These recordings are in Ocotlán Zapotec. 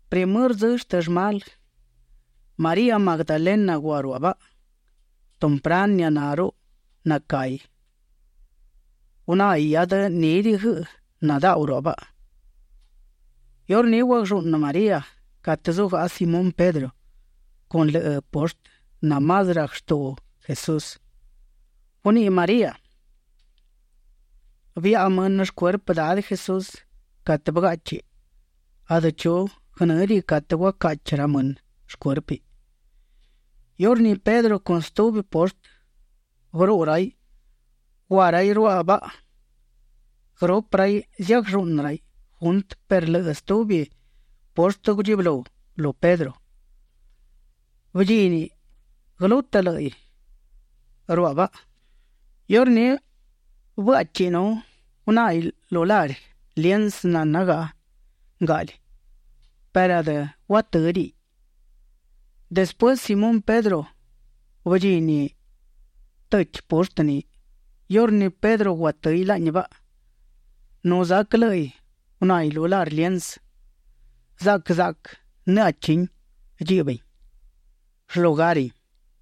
Primërë dzë shtë llmalë María Magdalena gua ruaꞌ baꞌa. Tumpranë nianá rruꞌu nacahi gunáhiꞌ hiadë nídiꞌi guëꞌë nadaꞌu ruaꞌ baꞌa. Iurní guaglluꞌnë María catë zúgaꞌa Simón Pedro con lëꞌë poshtë namás rac shtuꞌu Jesús. Guniꞌi María: ―Biaꞌa mënë shcuerpë Dadë Jesús catë bëgáꞌchiꞌ; adë chu guënë́diꞌi catë guacaꞌchi ra mënë shcuérpiꞌ. Iurní Pedro con stubi poshtë bëruꞌu raiꞌ. Gua raiꞌ ruaꞌ baꞌa. Guërupë raiꞌ ziaglluꞌnë raiꞌ juntë perë lëꞌë stubi poshtë gudchibëlú lu Pedro; bëdchíniꞌ guëlútëꞌ lë́ꞌiꞌ ruaꞌ baꞌa. Iurní bëáꞌchiꞌ nu gunáhiꞌ lu lari liensë nanagaꞌa ngaꞌli perë adë guatë́diꞌiꞌ. Despuësë Simón Pedro bëdchini tëchi poshtë ni. Iurní Pedro guatë́hiꞌ laꞌni baꞌa, nu zac lë́ꞌiꞌ gunáhiꞌ lu lari liensë; zaꞌquë zaꞌquë në́ꞌachi dchiꞌbin shlugarin.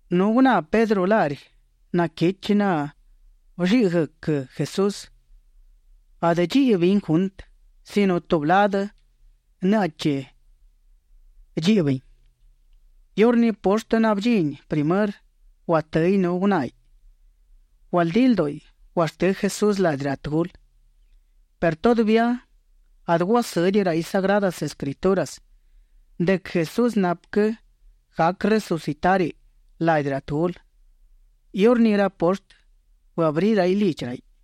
Nu guná Pedro lari naquichi nabëlliꞌi guëc Jesús; adë dchiꞌbin juntë sino tubi ladë në́ꞌachi dchiꞌbin. Iurní poshtë nabëdchini primërë, guatë́hiꞌ nu gunáhiꞌ. Gualdí ldúꞌiꞌ guashtë́ Jesús ladi ra tëgulë. Perë todavía adë guasë́diꞌi raiꞌ Sagradas Escrituras de quë Jesús napë quë gac resucitáriꞌ ladi ra tëgulë. Iurní ra poshtë bëabrí raiꞌ lidchi raiꞌ.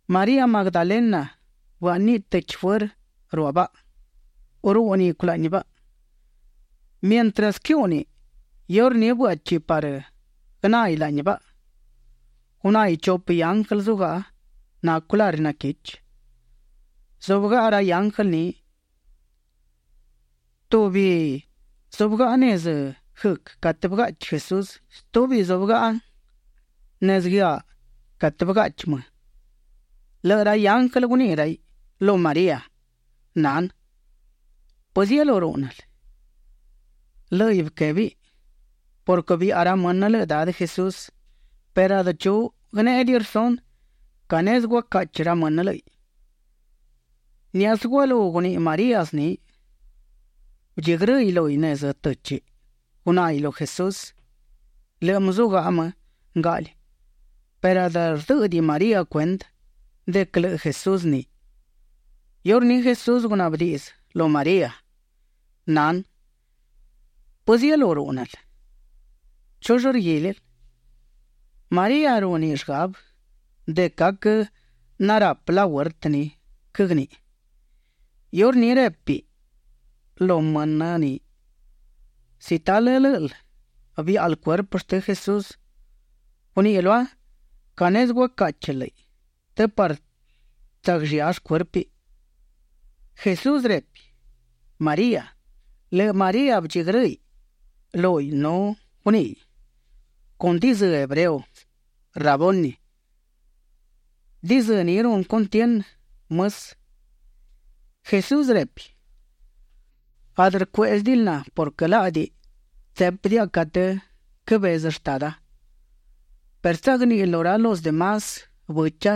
María Magdalena bëáꞌniꞌ tëchi fuërë ruaꞌ baꞌa. Rúꞌniꞌ culaꞌni baꞌa. Mientras quëhúꞌniꞌ, iurní bëáꞌchiꞌ parë guënáhiꞌ laꞌni baꞌa. Gunáhiꞌ chupë ianglë zugaꞌa; nacu raiꞌ lari naquichi. Zúbëgaꞌa ra ianglë ni; tubi zúbëgaꞌa nezë guëc catë bëgaꞌchi Jesús. Stubi zúbëgaꞌa nezë guëaꞌ catë bëgaꞌchi më. Lëꞌë ra ianglë guniꞌi raiꞌ lu María: ―Nanë, ¿pëzielú rúꞌnël? Lë́ꞌiꞌ bëquebi: ―Purquë biaꞌa ra mënë lëꞌë Dadë Jesús, perë adë chu guënéꞌediꞌi rsunë ca nezë guacaꞌchi ra mënë lë́ꞌiꞌ. Niáꞌasë gualú guniꞌi María zni, bëdchigrë́hiꞌ lúhiꞌ nezë të́chiꞌ; gunáhiꞌ lu Jesús. Lëꞌë më zugaꞌa më ngaꞌli perë adë rdë́ꞌëdiꞌi María cuendë de quë lëꞌë Jesús ni. Iurní Jesús gunaꞌbë díꞌdziꞌ lu María: ―Nanë, ¿pëzielú rúꞌnël? ¿Chull rguílil? María rúniꞌ llgabë de quë aquë narapë lahuertë ni quëgniꞌi. Iurní répiꞌ lu mënë ni: ―Si talë lë́ꞌël biáꞌal cuerpë shtë Jesús, guniꞌi lua ca nezë guacáꞌchil lë́ꞌiꞌ të parë tsagllía shcuérpiꞌ. Jesús repi: ―María. Lëꞌë María bëdchigrë́hiꞌ nu guníꞌiꞌ con dizë́ hebreo: ―Raboni. (Diꞌdzë ni runë cuntienë, Mësë.) Jesús repi: ―Adë cuéꞌzëdiꞌil na purquë laꞌdi tsépidiaꞌa catë quëbezë Shtada, perë tsagníꞌil lu ra los de más bëcha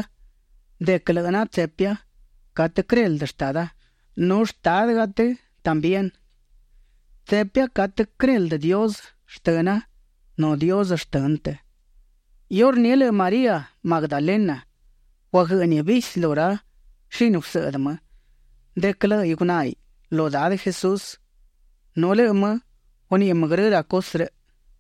de quë lëꞌë na tsepia catë quëreldë Shtada nu Shtádëgaꞌa të también. Tsepia catë quëreldë Dios shtëna nu Dios shtënë të. Iurní lëꞌë María Magdalena guaguë́ꞌniꞌ visi lu ra shini gusëꞌdë më de quë lë́ꞌiꞌ gunáhiꞌ lu Dadë Jesús nu lëꞌë më guniꞌi grë ra cusë rëꞌ.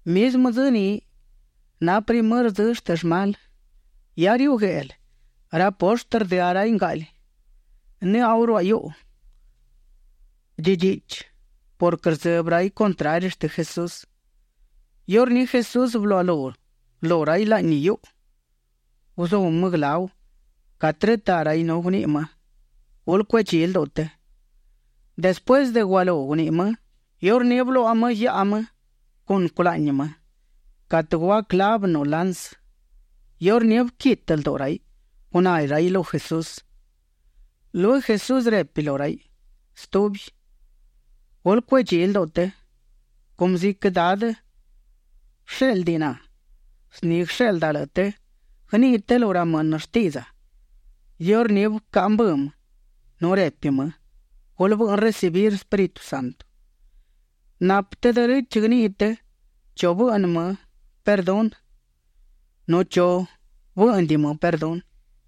Mizmë dzë ni na primërë dzë shtë llmalë; hia riuꞌ gueꞌlë; ra poshtë rdëá raiꞌ ngaꞌli. Nëꞌau ruaꞌ hiuꞌu dchidchiꞌchi purquë rdzëbë raiꞌ contrari shtë Jesús. Iurní Jesús bëluaꞌalú lu raiꞌ laꞌni hiuꞌu. Guzú më guëláu catë rëtaꞌ raiꞌ nu guniꞌi më: ―Gulë cuedchí lduꞌu të. Despuësë de gualú guniꞌi më, iurní bëluaꞌa më guiaꞌa më con culaꞌni më catë gua clavë nu lansë. Iurní bëquitë lduꞌu raiꞌ; guná raiꞌ lu Jesús. Lueguë Jesús repi lu raiꞌ stubi: ―Gulë cuedchí lduꞌu të. Cumë ziquë Dadë bëshéꞌldiꞌ na, zni guësheꞌlda lëꞌë të. Guëniꞌi të lu ra mënë shtiꞌdza. Iurní bëcaꞌa mbë më nu repi më: ―Gulë bëꞌnë recibir Espíritu Santo. Napë të derechë; guëniꞌi të chu bëꞌnë më perdunë, nu chu bë́ꞌnëdiꞌi më perdunë.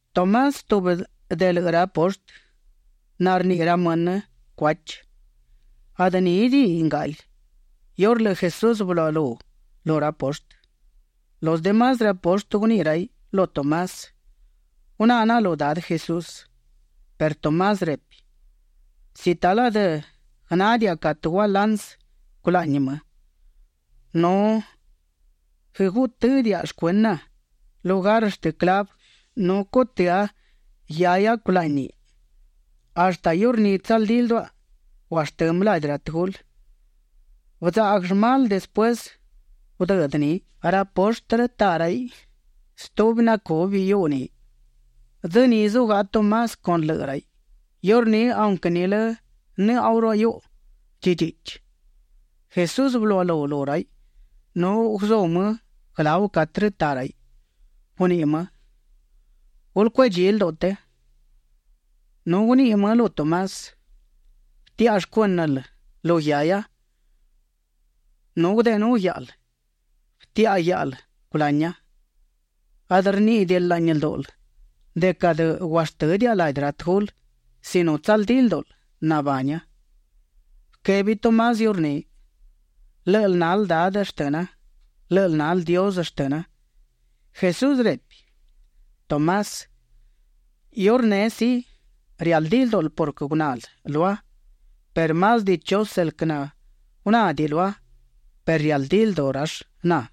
Tomás, tubi de lëꞌë ra poshtë narniꞌi ra mënë Cuachi, adë nídiꞌiꞌ ngaꞌli iurë lëꞌë Jesús bëluaꞌalú lu ra poshtë. Los de más ra poshtë guniꞌi raiꞌ lu Tomás: ―Guná naꞌa lu Dadë Jesús. Perë Tomás repi: ―Si talë adë guënádiaꞌa catë gua lansë culaꞌni më nu guëgutë́a shcuëna lugar shtë clavë nu cutë́a guiahia culáꞌniꞌ, hashtë iurní tsaldí lduaꞌa guashtë́ më ladi ra tëgulë. Bëdzaꞌguë llmalë despuësë gudëdë ni, ra poshtë rëtaꞌ raiꞌ stubi nacubi hiuꞌu ni. Dzë ni zugaꞌa Tomás con lëꞌë raiꞌ. Iurní aunquë nilë nëꞌau ruaꞌ hiuꞌu dchidchiꞌchi, Jesús bëluaꞌalú lu raiꞌ nu guzú më guëláu catë rëtaꞌ raiꞌ. Guniꞌi më: ―Gulë cuedchí lduꞌu të. Nu guniꞌi më lu Tomás: ―Bëtiaꞌa shcuë́nël lu guiahia nu gudeꞌenú guiáꞌal; bëtiaꞌa guiáꞌal culania. Adë rníꞌidiꞌil laꞌni ldúꞌul de quë adë guashtë́diaꞌa ladi ra tëgulë sino tsaldí ldúꞌul nabania. Bëquebi Tomás iurní: ―Lë́ꞌël nal Dadë shtëna. Lë́ꞌël nal Dios shtëna. Jesús repi: ―Tomás, iurneꞌ sí, rialdí ldúꞌul purquë gunal lua perë más dichusë el quë nagunádiꞌi lua perë rialdí lduꞌu rall na.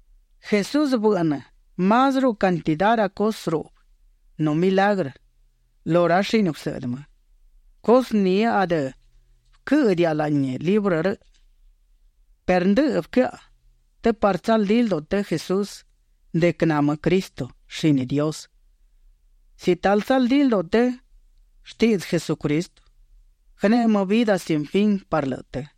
Jesús bëꞌnë másruꞌu cantidá ra cusë ruꞌbë nu milagrë lu ra shini gusëꞌdë më, cusë ni adë bëquë́ꞌëdiaꞌa laꞌni librë rëꞌ. Perë ndëꞌë bëquëaꞌa të parë tsaldí lduꞌu të Jesús de quë na më Cristo, shini Dios. Si talë tsaldí lduꞌu të shtiꞌdzë Jesucristo, guëneꞌe më vidë sin fin parë lëꞌë të.